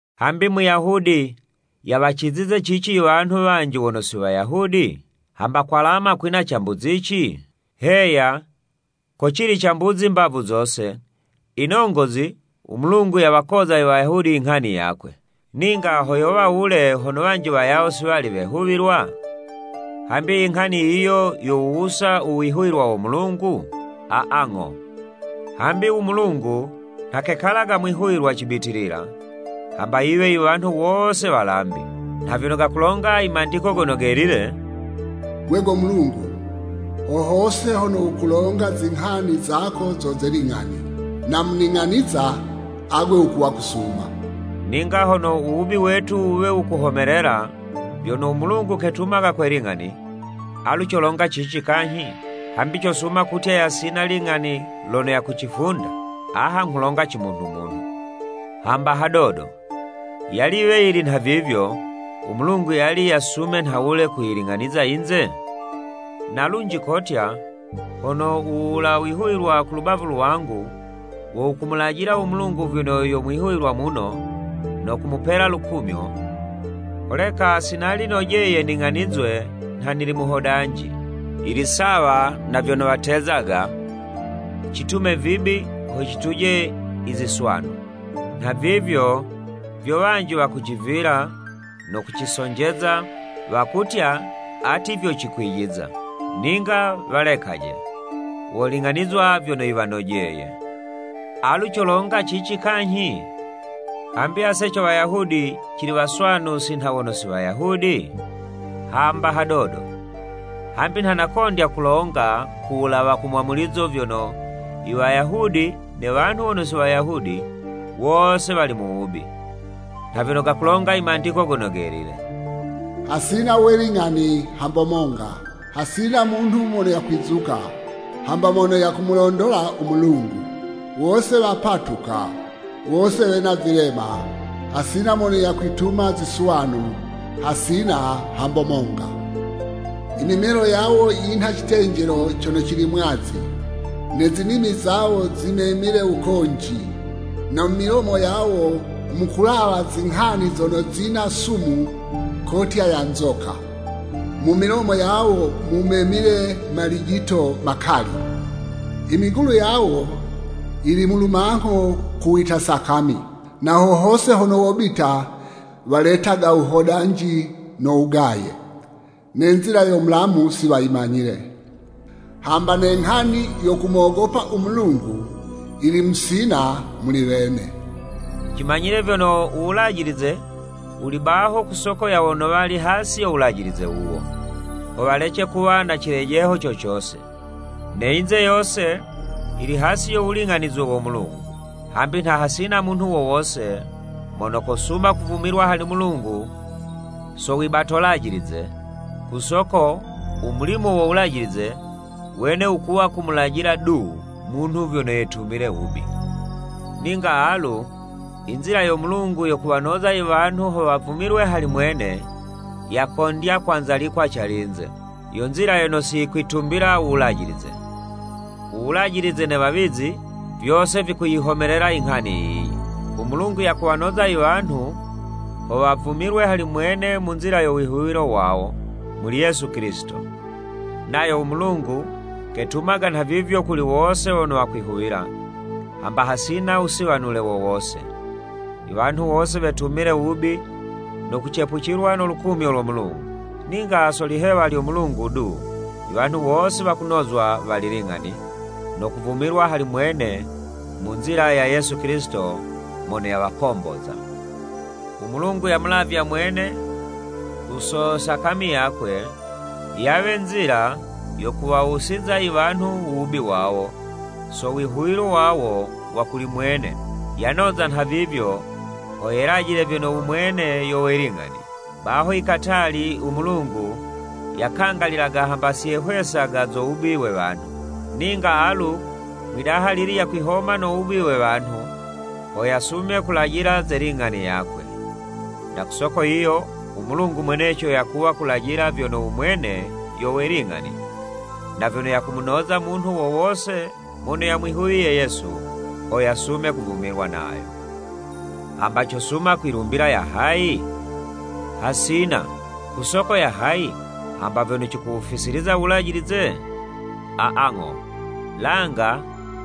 Hambi Muyahudi yawacizize cici iwanhu wanji wono si Wayahudi? Hamba kwalama kwina cambuzici? Heya, kocili cambuzi mbavu zose, inongozi, u Mulungu yawakoza i Wayahudi inghani yakwe. Ninga ho yowa wule hono wanji wayawo si wali wehuwilwa? Hambi inghani yiyo yowuwusa u wihuwilwa wo Mulungu? Aa, ng'o! Hambi u Mulungu nha kekalaga mwihuwilwa cibitilila, hamba yiwe iwanhu wose walambi. Nha vyono gakulonga i Mandiko Gono Gelile, “Gwe go Mulungu, ho hose hono wukulonga, Zinghani zako zo ze ling'ani, Na mu ning'aniza, agwe wukuwa kusuma.” Ninga hono u wubi wetu wuwe wukuhomelela, vyono u Mulungu ketumaga kwe ling'ani, alu colonga cici kanyhi? Hambi cosuma kutya yasina ling'ani lono yakucifunda? (Aha nghulonga cimunhu-munhu.) Hamba hadodo! Yali yiwe yili nhavivyo, u Mulungu yali yasume nhawule kuyiling'aniza yinze? Na lunji kotya, “Hono u wula wihuwilwa ku lubavu lwangu, wo wukumulajila u Mulungu vyono yo mwihuwilwa muno, no kumupela lukumyo, holeka si nali nojeye ning'anizwe nha nili muhodanji.” Yili sawa na vyono watezaga, “Citume vibi ho cituje i ziswanu!” Nhavivyo vyo wanji wakucivila, no kucisonjeza, wakutya ati vyo cikwijiza. Ninga walekaje! Woling'anizwa vyono yiwanojeye! Alu colonga cici kanyhi? Hambi ase co Wayahudi cili waswanu si nha wono si Wayahudi? Hamba hadodo! Hambi nha nakondya kulonga ku wulawa ha mwamulizo vyono, i Wayahudi ne wanhu wono si Wayahudi, wose wali mu wubi. Nha vyono gakulonga i Mandiko Gono Gelile. “Hasina we ling'ani hamba monga. Hasina munhu mono yakwizuka, hamba mono yakumulondola u Mulungu. Wose wapatuka, wose wena vilema, hasina mono yakwituma ziswanu, hasina hamba monga. Imimelo yawo yinha icitenjelo cono cili mwazi, ne zinimi zawo zimemile wukonji, na mu milomo yawo, mukulawa zinghani zono zina sumu kotya ya nzoka. Mu milomo yawo mumemile malijito makali. Imigulu yawo yili mu lumangho kuwita sakami, na ho hose hono wobita, waletaga wuhodanji no wugaye. Ne nzila yo mulamu, si wayimanyile, hamba ne nghani yo kumogopa u Mulungu, yili musina muli wene.” Cimanyile vyono, u Wulajilize wuli baho ku soko ya wono wali hasi yo Wulajilize wuwo, ho walece kuwa na cikojelo co cose. Ne yinze yose yili hasi yo wuling'anizwe wo Mulungu. Hambi nha hasina munhu wo wose, mono kosuma kuvumilwa hali Mulungu so wibato 'lajilize, ku soko u mulimo wo Wulajilize, wene wukuwa kumulajila du munhu vyono yetumile wubi. Ninga alu, inzila yo Mulungu yo kuwanoza iwanhu ho wavumilwe hali mwene, yakondya kwanzalikwa calinze, yo nzila yono si yikwitumbila u Wulajilize. Uwulajilize ne wawizi, vyose vikuyihomelela inghani yiyi. U Mulungu yakuwanoza iwanhu, ho wavumilwe hali mwene mu nzila yo wihuwilo wawo, muli Yesu Kilisito: Nayo u Mulungu, ketumaga nhavivyo kuli wose wono wakwihuwila, hamba hasina wusiwanule wo wose. Iwanhu wose wetumile wubi no kucepucilwa no lukumyo lo Mulungu. Ninga so lihewa lyo Mulungu du, iwanhu wose wakunozwa wali ling'ani, no kuvumilwa hali mwene mu nzila ya Yesu Kilisito mono yawakomboza. U Mulungu yamulavya mwene, ku so sakami yakwe, yawe nzila yo kuwawusiza iwanhu u wubi wawo, so wihuwilo wawo wa kuli mwene. Yanoza nhavivyo, ho yelajile vyono u Mwene yo we ling'ani. Baho ikatali u Mulungu yakangalilaga hamba si yehwesaga zo wubi we wanhu, ninga alu, mwidaha lili yakwihoma no wubi we wanhu, ho yasume kulajila ze ling'ani yakwe. Na ku soko yiyo u Mulungu mweneco yakuwa kulajila vyono u mwene yo we ling'ani, na vyono yakumunoza munhu wo wose mono yamwihuwiye Yesu, ho yasume kuvumilwa nayo. Hambi cosuma kwilumbila ya hayi? Hasina! Ku soko ya hayi? Hamba vyono cikuwufisiliza u wulajilize? Aa, ng'o, langa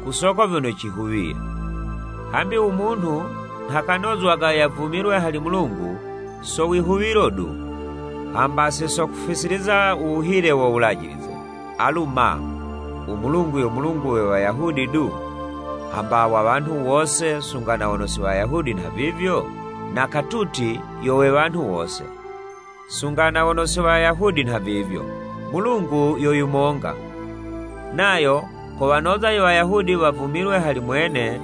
ku soko vyono cihuwiye. Hambi u munhu nha kanozwaga yavumilwe hali Mulungu so wihuwilo, du, hamba si so kufisiliza u wuhile wo wulajilize. Alu ma, u Mulungu yo Mulungu we Wayahudi du, hamba wa wanhu wose, sunga na wono si Wayahudi nhavivyo? Na katuti yo we wanhu wose, sunga na wono si Wayahudi nhavivyo. Mulungu yo yumonga, nayo kowanoza i Wayahudi wavumilwe hali mwene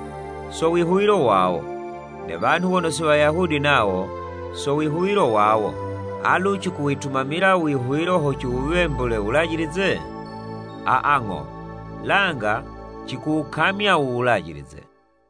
so wihuwilo wawo, ne wanhu wono si Wayahudi nawo, so wihuwilo wawo. Alu cikuwitumamila u Wihuwilo ho ciwuwembule u Wulajilize? Aa, ng'o, langa cikuwukamya u Wulajilize.